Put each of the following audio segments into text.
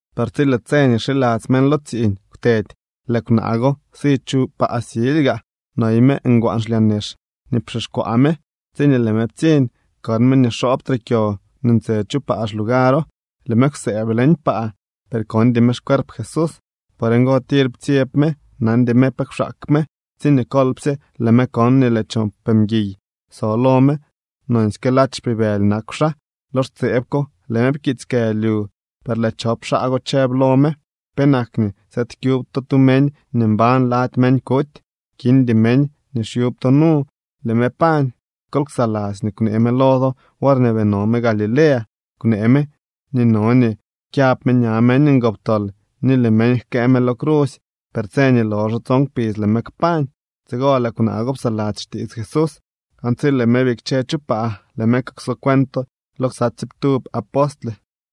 Per tsi lëë tse nii xiladzy meñ lo tsiiñ kwtedy, lëë kwnaa go si chu paa silyga. Noy me ngwaan xlyaa nex nii pxixkwaa me. Tsiñee lëë me ptsiñ, kon me nii xoobtre kyo nii ntse chu paa xlugaro. Lëë me kwsëëb leñ paa, per kondy me xcuerp Jesús. Por ngo, tir ptsyeb me, nandy me pe kwxaak me, tsiñee kolpsye lëë me kon nii lëë chop mguiy so lo me nonsyke ladx xpibëly nakw xaa. Lo xtseeb ko lëë me pkiits kë lyu, per lëë chop xaa go chëb lo me: —¿Penak nii sëëd kyub to tu meñ nii mbañ lady meñ kuty? Kindy meñ nii xyub to nu, lëë me pañ. Kol ksaladzy nii kwnee me lo do worñee bii no me Galilea. Kwnee me nii no nii kyab me ña meñ ngoptol, ni lëë meñ jkëë me lo crusy, per tse nii loxo tson kpidz lëë me kpañ. Tsigo lëë kwnaa go psaladzy xtiits Jesús, aan tsi lëë me bikche chu paa, lëë me kukso cuento lo ksa tsiiptub apostle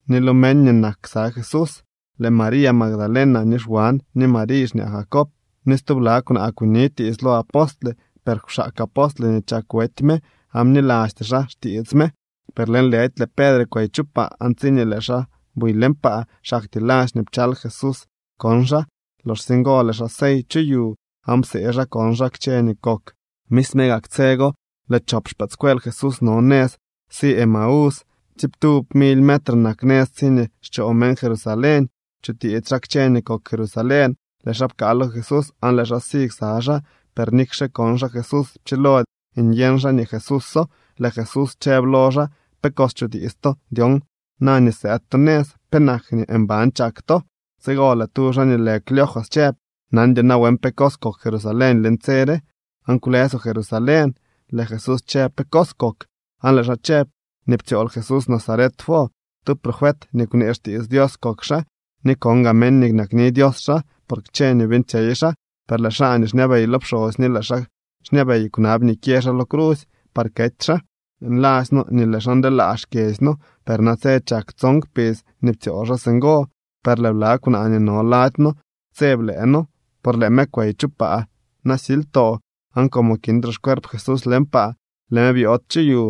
ni lo meñ nii nak ksa Jesús. Lëë María Magdalena, ni Xwan, ni Mariy xñaa Jacob, ni stubla kwnaa kunitiits lo apostle. Per kwxaak apostle nii chak wety me aan bnilasty xaa xtiits me. Per lëënlëdy lëë Pedre kwey chu paa, aan tsiñee lëë xaa buy leñ paa, xaktyee ladx nii pchal Jesús kon xaa. Loxsye ngo lëë xaa sey chu yu aan psee xaa kon xaa kchë nii kok. Misme gak tse go lëë chop xpëëdscuel Jesús no nëz si Emaús. Tsiiptub mily metre nak nëz tsiñee xchoo meñ Jerusalén. Chutiits xaa kchë nii kok Jerusalén. Lëë xaa pkaa lo Jesús aan lëë xaa si ksa xaa. Per nikxe kon xaa Jesús, pchilody nyeñ xaa nii Jesúso. Lëë Jesús chëb lo xaa: —¿Pe cos chutiits to dyon na nii sëëd to nëz? ¿Penak nii mban chak to? Tsigo lëë tu xaa nii lë Cleofas chëb: —¿Nandyoo nawen pe cos kok Jerusalén leñ tse re, aan kwlësoo Jerusalén? Lëë Jesús chëb: —¿Pe cos kok? Aan lëë xaa chëb: —Nii ptsyool Jesús Nazaret wo. Tu profet nii kwnee xtiits Dios kok xaa ni kon gaa meñ nii nakni Dios xaa, por kchë nii beeñtsyey xaa. Per lëë xaa nii xñabey lo pxosy ni lëë xaa xñabey kwnab nii kyë xaa lo crusy par kety xaa. Nladzy noo nii lëë xaa ndeelaa xkyedzy noo. Per natse chak tson kpidz nii ptsyool xaa singo. Per lëë bla kwnaa nii no lady noo ptseb lëë noo, por lëë me kwey chu paa nasilytoo, aan como kintre xcuerp Jesús leñ paa, lëë me byood chu yu.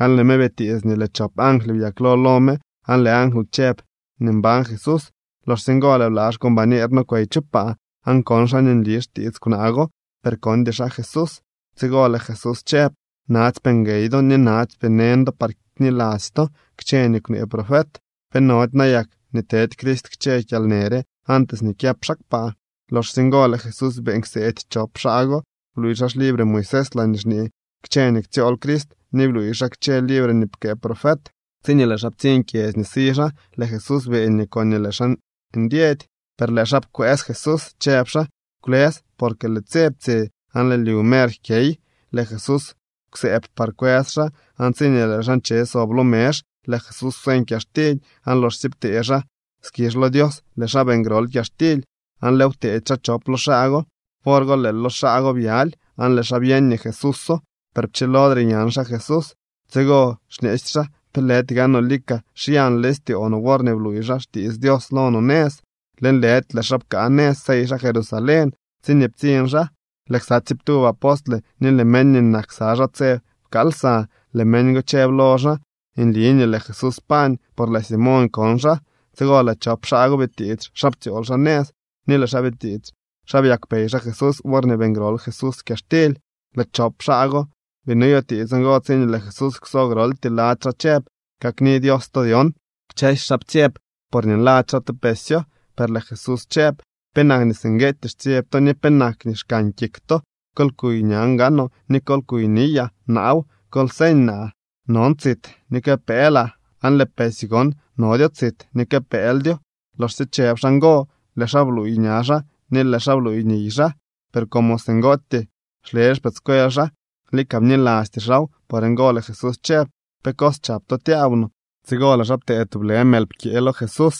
Aan lëë me bitiits nii lëë chop angly byaklo lo me aan lëë angly chëb nii mbañ Jesús. Loxsye ngo lëë bla xcombañer noo kwey chu paa, aan kon xaa nii nli xtiits kwnaa go, per kondy xaa Jesús. Tsigo lëë Jesús chëb: —¡Natsypee nguey do ni natsypee neñ do par kniladzy to kchë nii kwnee profet! ¿Pe nody nayak nii tedy Crist kchë kyalnë re antes nii kyëp xaa kpaa? Loxsye ngo lëë Jesús beeñ kseedy chop xaa go, bluuy xaa xlibre Moisés laañee xñee kchë nii ktsyool Crist ni bluuy xaa kchë libre nii pkëë profet. Tsiñee lëë xaa ptsiñ kyedzy nii si xaa, lëë Jesús beeñ nii koñee lëë xaa ndyedy. Per lëë xaa pkwëës Jesús, chëb xaa: —Kwlës, porque lëë tse ptsye, aan lëë lyu mer jkyey. Lëë Jesús kwsëëb par kwës xaa. Aan tsiñee lëë xaa nche sob lo mezh, lëë Jesús kwseñ kyaxtily, aan loxsye ptee xaa skizh lo Dios, lëë xaa beeñ grol kyaxtily aan lëëw pteedy xaa chop lo xaa go. Wor go lëë lo xaa byaly, aan lëë xaa byeñ nii Jesúso. Per pchilodre nyan xaa Jesús. Tsigo xñeesy xaa: —¿Pe lëdy gaanoo lika xyan leñ styoo no worñee bluuy xaa xkitsy Dios lo no nëz? Lëënlëdy lëë xaa pkaa nëz, sey xaa Jerusalén. Tsiñee ptsiñ xaa, lëë ksa tsiiptub apostle ni lëë meñ nii nak ksa xaa tse pkaal lsa. Lëë meñ go chëb lo xaa: —Nli nii lëë Jesús pañ, por lëë Simoñ kon xaa. Tsigo lëë chop xaa go bitiits xa ptsyool xaa nëz, ni lëë xaa bitiits xa byakpey xaa Jesús worñee beeñ grol Jesús kyaxtily. Lëë chop xaa go bii noyutiits ngo tsiñee lëë Jesús kwso groltyee lady xaa chëb: —Kakni Dios to dyon. Kchësy xaa ptsyeb porñee nladzy xaa te pesyo. Per lëë Jesús chëb: —¿Penak nii singueetyee xtsyeb to, ni penak nii xkan kik to? Kol kuy ñan gaanoo ni kol kuy niyaa. Naaw. Kol seeñ naa. Non tsit ni kë pëëlaa, aan lëë pesy gon nodyo tsit ni kë pëëldyo. Loxsye chëb xaa ngo, lëë xaa bluuy ña xaa ni lëë xaa bluuy niy xaa. Per como singootyee xle xpëëdscuel xaa, lika bnilasty xaaw, por ngo lëë Jesús chëb: —¿Pe cos chap to tyaaw no? Tsigo lëë xaa ptee tublë mël pkyee lo Jesús,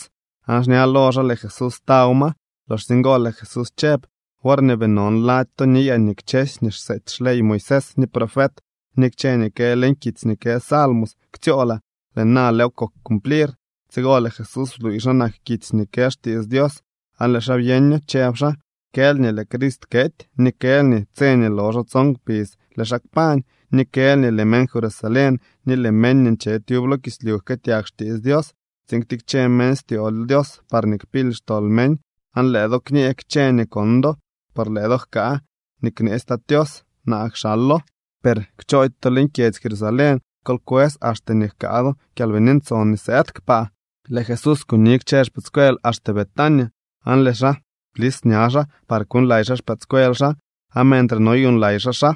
aan xña lo xaa lëë Jesús taw ma. Loxsye ngo lëë Jesús chëb: —Worñee bii non lady to niyaa nii kchësy nii xseety xley Moisés, ni profet, ni kchë nii kë leñ kitsy nii kë salmos ktsyoolaa. Lëë na lëëw kok cumplir. Tsigo lëë Jesús bluuy xa nak kitsy nii kë xtiits Dios aan lëë xaa byeño, chëb Jesús: —Kël nii lëë Crist kety, ni kël nii tse nii loxo tson kpidz lëë xaa kpañ. Ni kël nii lëë meñ Jerusalén ni lëë meñ nii nche tyub lo kislyu jkëëtyag xtiits Dios tsiin ktikche meñ styoo lo Dios parñee kpily xtol meñ. Aan lëë do kñee kchë nii kon do. Por lëë do jkaa nii kneetsy Tat Tios. Naa kxalo. Per kchoody to leñ kyedzy Jerusalén. Kol kwës axte nii jkaa do Kyalbini Ntson nii sëëd kpaa. Lëë Jesús kuni kchë xpëëdscuel axte Betania, aan lëë xaa blis ña xaa par kuuñlay xaa xpëëdscuel xaa. Aan mentre noyuuñlay xaa xaa,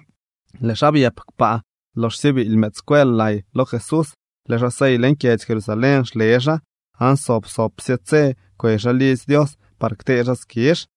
lëë xaa byëp kpaa. Loxsye biily mëëdscuel lay lo Jesús, lëë xaa sey leñ kyedzy Jerusalén xle xaa, aan sob sobsye tse kwey xaa lidzy Dios par ktee xaa skizh.